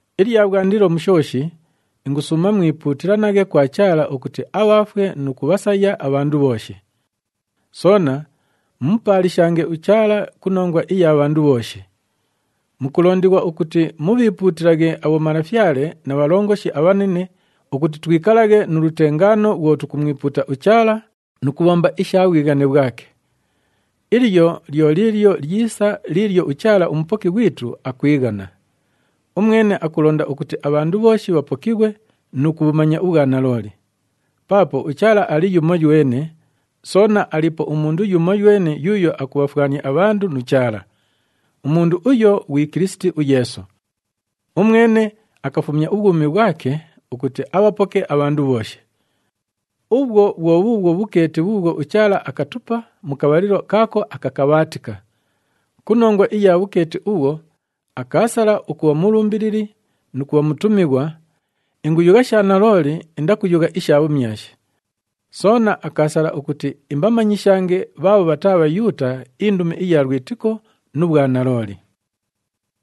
Ilya bhwandilo mu shooshi, ingusuuma mwipuutilanaghe kwa Chaala ukuti abhaafwe nu kubhasaya abhandu bhooshi. Soona mumupaalishange uChaala ku nongwa iya bhandu bhooshi. Mukulondighwa ukuti mubhiipuutilaghe abhomalafyale na bhalongoshi abhanine ukuti twikalaghe nu lutengaano bhwo tukumwipuuta uChaala nu kubhomba isha bhwighane bhwake. Ilyo lyo liilyo lyisa liilyo uChaala uMupoki ghwitu akwighana. Umwene akulonda ukuti abhandu bhooshi bhapokighwe nu kubhumanya ubhwanalooli. Paapo uChaala ali yumoywene, soona aliipo umundu yumoywene yuuyo akubhafwania abhandu nu Chaala. Umundu uyo ghwi Kilisiti uYeesu. Umwene akafumya ubhwumi bhwake ukuti abhapoke abhandu bhooshi. Ubhwo bhwo bhuubhwo bhukeeti bhuubhwo uChaala akatupa mu kabhalilo kaako akakabhaatika. Ku nongwa iya bhukeeti ubhwo, akaasala ukubha mulumbilili nu kubha mutumighwa (inguyugha sha nalooli, indakuyugha isha bhumyashi). Soona akaasala ukuti imbamanyishange bhaabho bhataa Bhayuuta indumi iya lwitiko nu bhwanalooli.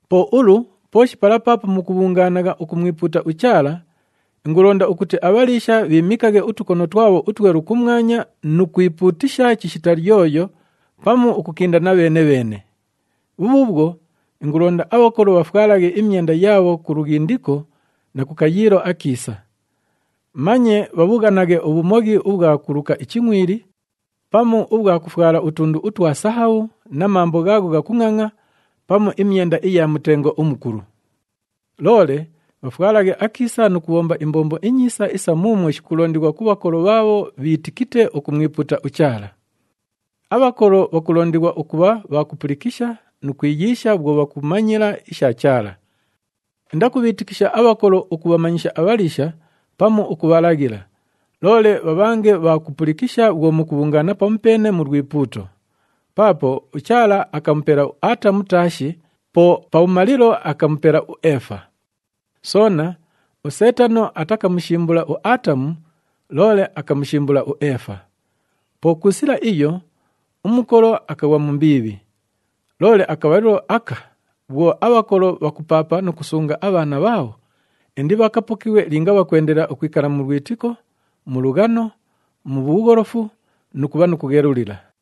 Po ulu, pooshi pala paapo mukubhungaanagha ukumwipuuta uChaala, ingulonda ukuti abhaliisha bhiimikaghe utukono twabho utwelu kumwanya nu kwipuutisha chishita lyoyo pamu ukukindana bheene-bheene. Bhubhuubhwo, ingulonda abhakolo bhafwalaghe imyenda yaabho ku lughindiko na ku kayiilo akiisa. Manye bhabhughanaghe ubhumoghi ubhwa kuluka ichingʼwili, pamu ubhwa kufwala utundu utwa sahabhu na mambo ghaagho ghakungʼangʼa pamu imyenda iya mutengo umukulu. Loole bhafwalaghe akiisa nu kubhomba imbombo inyiisa isa muumwo shikulondighwa ku bhakolo bhaabho bhiitikite ukumwipuuta uChaala. Abhakolo bhakulondighwa ukubha bha kupulikisha nu kwiyiisha bhwo bhakumanyila isha Chaala. Indakubhiitikisha abhakolo ukubhamanyisha abhaliisha pamu ukubhalaghila, loole bhabhange bha kupulikisha bhwo mukubhungaana pamupeene mu lwipuuto. Paapo uChaala akamupela uAatamu taashi, po pabhumalilo akamupela uEefa. Soona, uSeetano atakamushimbula uAatamu, loole akamushimbula uEefa. Po ku sila iyo, umukolo akaghwa mu mbiibhi. Loole akabhalilo aka bhwo abhakolo bhakupaapa nu kusunga abhaana bhaabho, indibhakapokighwe linga bhakwendelela ukwikala mu lwitiko, mu lughano, mu bhugholofu nu kubha nu kughelulila.